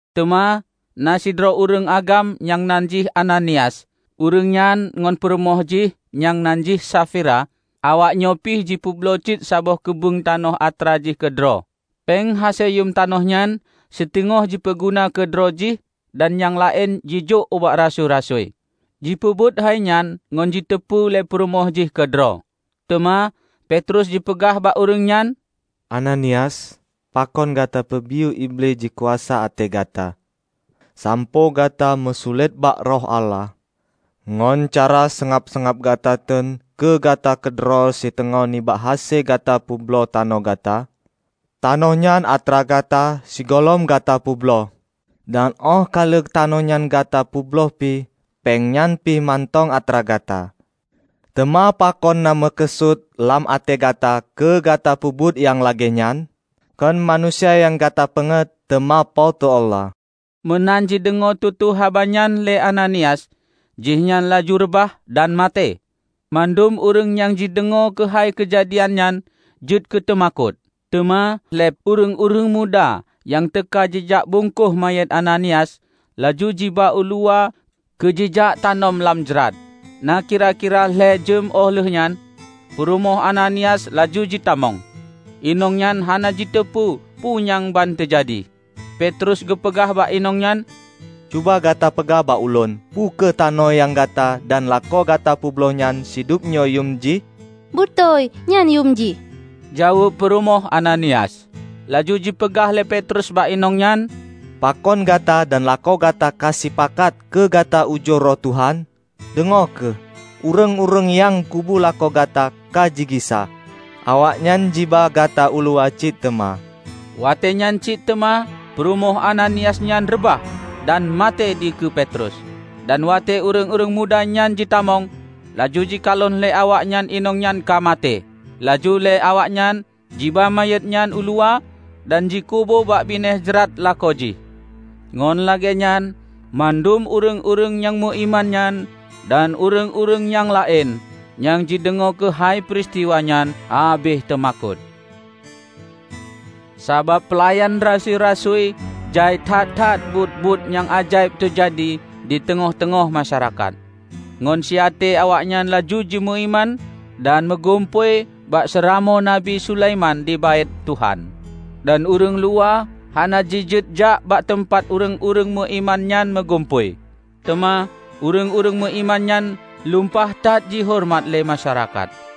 Teuma na sidroe ureuëng agam nyang nan jih Ananias, ureuëng nyan ngon purumoh jih nyang nan jih Safira, awaknyoe pih jipeubloe cit saboh keubeueng tanoh atra jih keudroe. Péng hase yuem tanoh nyan siteungoh jipeuguna keu droe jih dan nyang laén jijôk ubak rasui-rasui. Jipeubuet hainyan ngon jiteupeu lé purumoh jih keudroe. Teuma Petrus jipeugah bak ureuëng nyan, "Ananias, pakon gata peubiyeu Iblih jikuasa até gata, sampoe gata meusulet bak Roh Allah, ngon cara seungab-seungab gata teun keu gata keudroe siteungoh nibak hase gata peubloe tanoh gata? Tanoh nyan atra gata sigohlom gata peubloe. Dan óh ka lheueh tanoh nyan gata peubloe pih, péng nyan pih mantong atra gata. Teuma pakon na meukeusut lam até gata keu gata peubuet nyang lagée nyan? Kon manusia nyang gata peungeuet teuma Po teu Allah!" Meunan jideungoe tutoe haba nyan lé Ananias, jihnyan laju reubah, dan maté. Mandum ureuëng nyang jideungoe keuhai keujadian nyan jeuet keuteumakot. Teuma lé ureuëng-ureuëng muda nyang teuka jijak bungkôh manyét Ananias, laju jiba uluwa keu jijak tanom lam jrat. Na kira-kira lhée jeuem óh lheueh nyan purumoh Ananias laju jitamong. Inong nyan hana jiteupeue peue nyang ban teujadi. Petrus geupeugah bak inong nyan, "Cuba gata peugah bak ulôn: Peu kheueh tanoh nyang gata dan lakoe gata peubloe nyan, sidubnyoe yuem jih?" "Beutôi, nyan yuem jih," jaweueb purumoh Ananias. Laju jipeugah lé Petrus bak inong nyan, "Pakon gata dan lakoe gata ka sipakat keu gata ujoe Roh Tuhan? Deungoe kheueh! Ureuëng-ureuëng nyang kubu lakoe gata ka jigisa. Awaknyan jiba gata uluwa cit teuma." Watée nyan cit teuma peurumoh Ananias nyan reubah dan maté dikeue Petrus. Dan watée ureuëng-ureuëng muda nyan jitamong, laju jikalon lé awaknyan inong nyan ka maté. Laju lé awaknyan jiba manyét nyan uluwa dan jikubu bak binéh jrat lakoe jih. Ngon lagée nyan mandum ureuëng-ureuëng nyang meuiman nyan dan ureuëng-ureuëng nyang laén, nyang jideungoe keuhai peuristiwa nyan, habéh teumakot. Sabab peulayanan rasui-rasui jai that-that buet-buet nyang ajaéb teujadi diteungoh-teungoh masyarakat. Ngon siaté awaknyan laju jimeuiman dan meugumpôi bak Seuramoe Nabi Sulaiman di Baét Tuhan. Dan ureuëng luwa hana jijeuet jak bak teumpat ureuëng-ureuëng meuiman nyan meugumpôi. Teuma ureuëng-ureuëng meuiman nyan lumpah that jihoreumat lé masyarakat.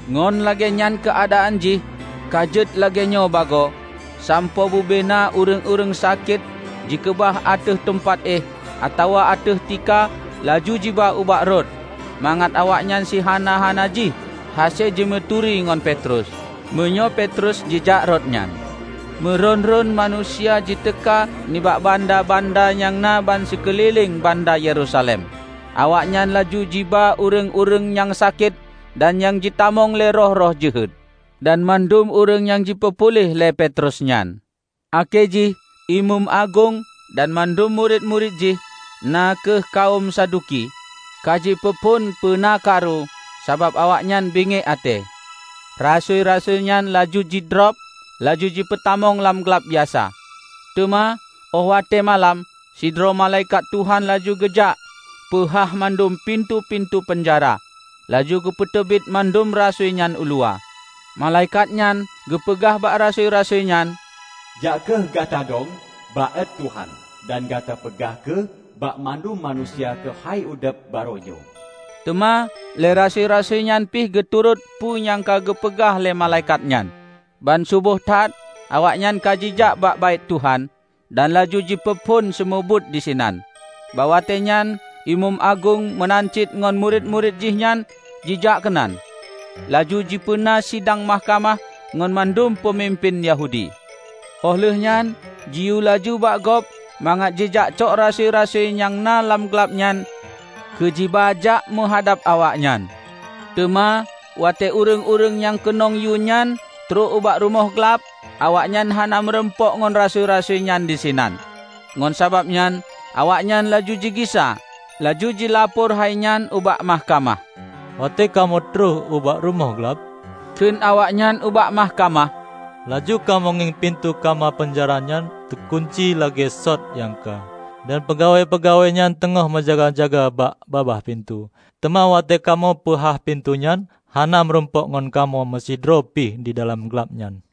Ngon lagée nyan keuadaan jih ka jeuet lagée nyan bagoe, sampoe bubena ureuëng-ureuëng sakét jikeubah ateueh teumpat éh atawa ateueh tika, laju jiba ubak rot, mangat awaknyan sihana-hana jih hase jimeuturi ngon Petrus, meunyoe Petrus jijak rot nyan. Meuron-ron manusia jiteuka nibak banda-banda nyang na ban sikeulileng banda Yerusalem. Awaknyan laju jiba ureuëng-ureuëng nyang sakét dan nyang jitamong lé roh-roh jeuhet. Dan mandum ureuëng nyang jipeupuléh lé Petrus nyan. Akhé jih imeum agong dan mandum murit-murit jih, na kheueh kawöm Saduki, kajipeuphon peuna karu, sabab awaknyan bingiek até. Rasui-rasui nyan laju jidrob, laju jipeutamong lam glab biasa. Teuma óh watée malam, sidroe malaikat Tuhan laju geujak peuhah mandum pintoe-pintoe peunjara, laju geupeuteubiet mandum rasui nyan uluwa. Malaikat nyan geupeugah bak rasui-rasui nyan, "Jak kheueh gata dong bak Baét Tuhan dan gata peugah kheueh bak mandum manusia keuhai udeb barô nyoe." Teuma lé rasui-rasui nyan pih geuturot peue nyang ka geupeugah lé malaikat nyan. Ban suboh that awaknyan ka jijak bak Baét Tuhan dan laju jipeuphon seumeubeuet disinan. Bak watée nyan imeum agong meunan cit ngon murit-murit jihnyan jijak keunan, laju jipeuna sidang mahkamah ngon mandum peumimpén Yahudi. Óh lheueh nyan jiyue laju bak gob mangat jijak cok rasui-rasui nyang na lam glab nyan keu jiba jak meuhadab awaknyan. Teuma watée ureuëng-ureuëng nyang keunong yue nyan trok ubak rumoh glab, awaknyan hana meurumpok ngon rasui-rasui nyan disinan. Ngon sabab nyan awaknyan laju jigisa, laju jilapor hainyan ubak mahkamah. "Watée kamoe trok ubak rumoh glab," kheun awaknyan ubak mahkamah, "laju kamoe ngieng pintoe kama peunjara nyan teugunci lagée sot nyang ka, dan peugawée-peugawée nyan teungoh meujaga-jaga bak babah pintoe. Teuma watée kamoe peuhah pintoe nyan, hana meurumpok ngon kamoe meusidroe pih didalam glab nyan."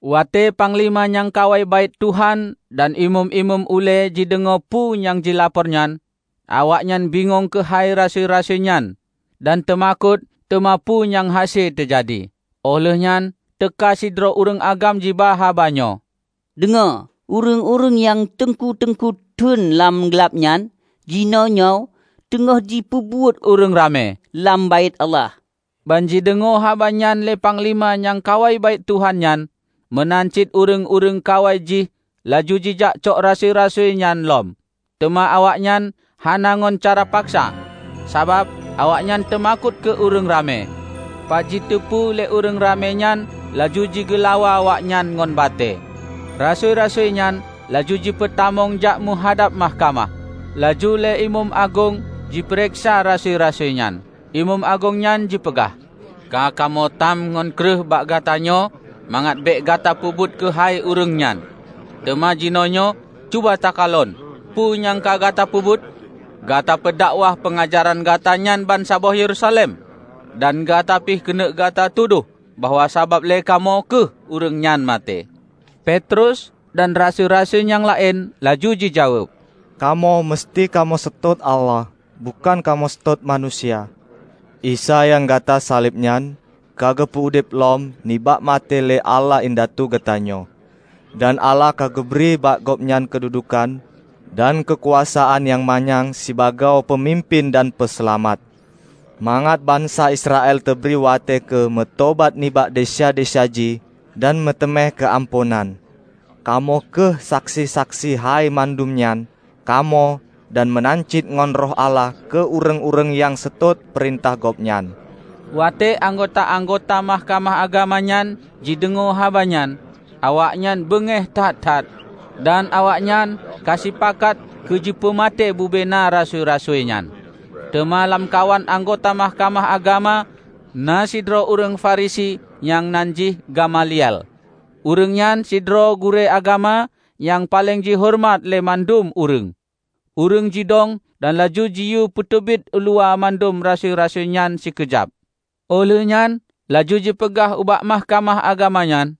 Watée panglima nyang kawai Baét Tuhan dan imeum-imeum ulée jideungoe peue nyang jilapor nyan, awaknyan bingong keuhai rasui-rasui nyan dan teumakot teuma peue nyang hase teujadi. Óh lheuehnyan teuka sidroe ureuëng agam jiba haba nyoe, "Deungoe! Ureuëng-ureuëng nyang teungku-teungku teun lam glab nyan jinoenyoe teungoh jipeubeuet ureuëng ramé lam Baét Allah!" Banjideungoe haba nyan lé panglima nyang kawai Baét Tuhan nyan meunan cit ureuëng-ureuëng kawai jih laju jijak cok rasui-rasui nyan lom. Teuma awaknyan hana ngon cara paksa, sabab awaknyan teumakot keu ureuëng ramé, pat jiteupeue lé ureuëng ramé nyan laju jigeulawa awaknyan ngon batée. Rasui-rasuinyan laju jipeutamong jak meuhadab mahkamah. Laju lé imeum agong jipareksa rasui-rasui nyan. Imeum agong nyan jipeugah, "Ka kamoe tam ngon kreueh bak gatanyoe mangat bék gata peubeuet keuhai Ureuëng nyan. Teuma jinoenyoe cuba takalon peue nyang ka gata peubuet! Gata peudakwah peungajaran gata nyan bansaboh Yerusalem, dan gata pih keuneuk gata tudoh bahwa sabab lé kamoe kheueh Ureuëng nyan maté." Petrus dan rasui-rasui nyang laén laju jijaweueb, "Kamoe museuti kamoe seutôt Allah bukon kamoe seutôt manusia. Isa nyang gata saleb nyan, ka geupeu udeb lom nibak maté lé Allah indatu geutanyoe. Dan Allah ka geubri bak Gobnyan keududukan dan keukuasaan nyang manyang sibagoe Peumimpén dan Peuseulamat; mangat bansa Israel teubri watée keu meutobat nibak desya-desya jih dan meuteumé keuamphonan. Kamoe kheueh saksi-saksi keuhai mandum nyan -- Kamoe dan meunan cit ngon Roh Allah keu ureuëng-ureuëng nyang seutôt peurintah Gobnyan." Watée anggota-anggota Mahkamah Agama nyan jideungoe haba nyan, awaknyan beungéh that-that, dan awaknyan ka sipakat keu jipeumaté bubena rasui-rasui nyan. Teuma lamkawan anggota mahkamah agama na sidroe ureuëng Farisi nyang nan jih Gamaliel. Ureuëng nyan sidroe gurée agama nyang paleng jihoreumat lé mandum ureuëng. Ureuëng jidong dan laju jiyue peuteubiet uluwa mandum rasui-rasui nyan sikeujab. Óh lheueh nyan laju jipeugah ubak Mahkamah Agama nyan,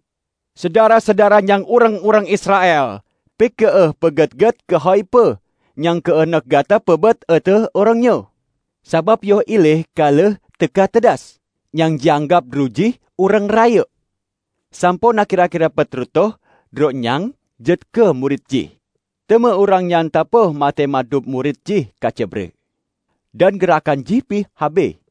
"Syedara-syedara nyang ureuëng-ureuëng Israel! Pike kheueh beugét-gét keuhai peue nyang keuneuk gata peubuet ateueh ureuëng nyoe. Sabab yoh ilée ka lheueh teuka Teudas, nyang jianggab droe jih ureuëng rayeuk, sampoe na kira-kira peuet reutôh droe nyang jeuet keu murit jih. Teuma ureuëng nyan teupoh maté mandum murit jih ka cre bre, dan geurakan jih pih habéh.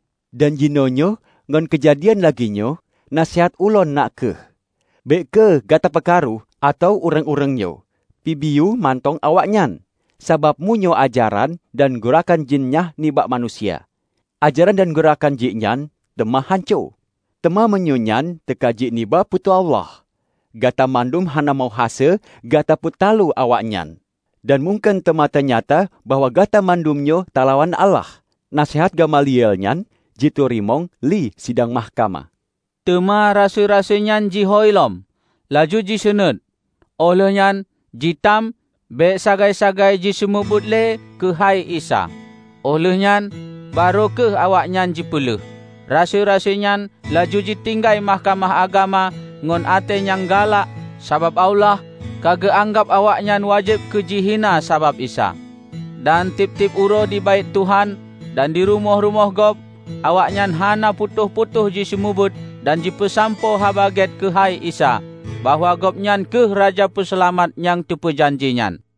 Dan jinoe nyoe ngon keujadian lagée nyoe, naseuhat ulôn na kheueh: bék kheueh gata peukaru ateueh ureuëng-ureuëng nyoe, peubiyeu mantong awaknyan. Sabab meunyoe ajaran dan geurakan jih nyan nibak manusia, ajaran dan geurakan jih nyan teuma hanco. Teuma meunyoe nyan teuka jih nibak Po teu Allah, gata mandum hana meuhase gata peutaloe awaknyan. Dan mungken teuma teunyata bahwa gata mandumnyoe talawan Allah." Naseuhat Gamaliel nyan jiteurimong lé sidang mahkamah. Teuma rasui-rasui nyan jihôi lom, laju jiseunuét, óh lheueh nyan jitam bék sagai-sagai jiseumeubeuet le keuhai Isa. Óh lheueh nyan, barô kheueh awaknyan jipeuleueh. Rasui-rasuinyan laju jitinggai Mahkamah Agama ngon até nyang galak sabab Allah ka geuanggab awaknyan wajéb keu jihina sabab Isa. Dan tieb-tieb uroe di Baét Tuhan dan di rumoh-rumoh gob, awaknyan hana putôh-putôh jiseumeubeuet dan jipeusampoe Haba Gét keuhai Isa bahwa Gobnyan kheueh Raja Peuseulamat nyang teupeujanji nyan.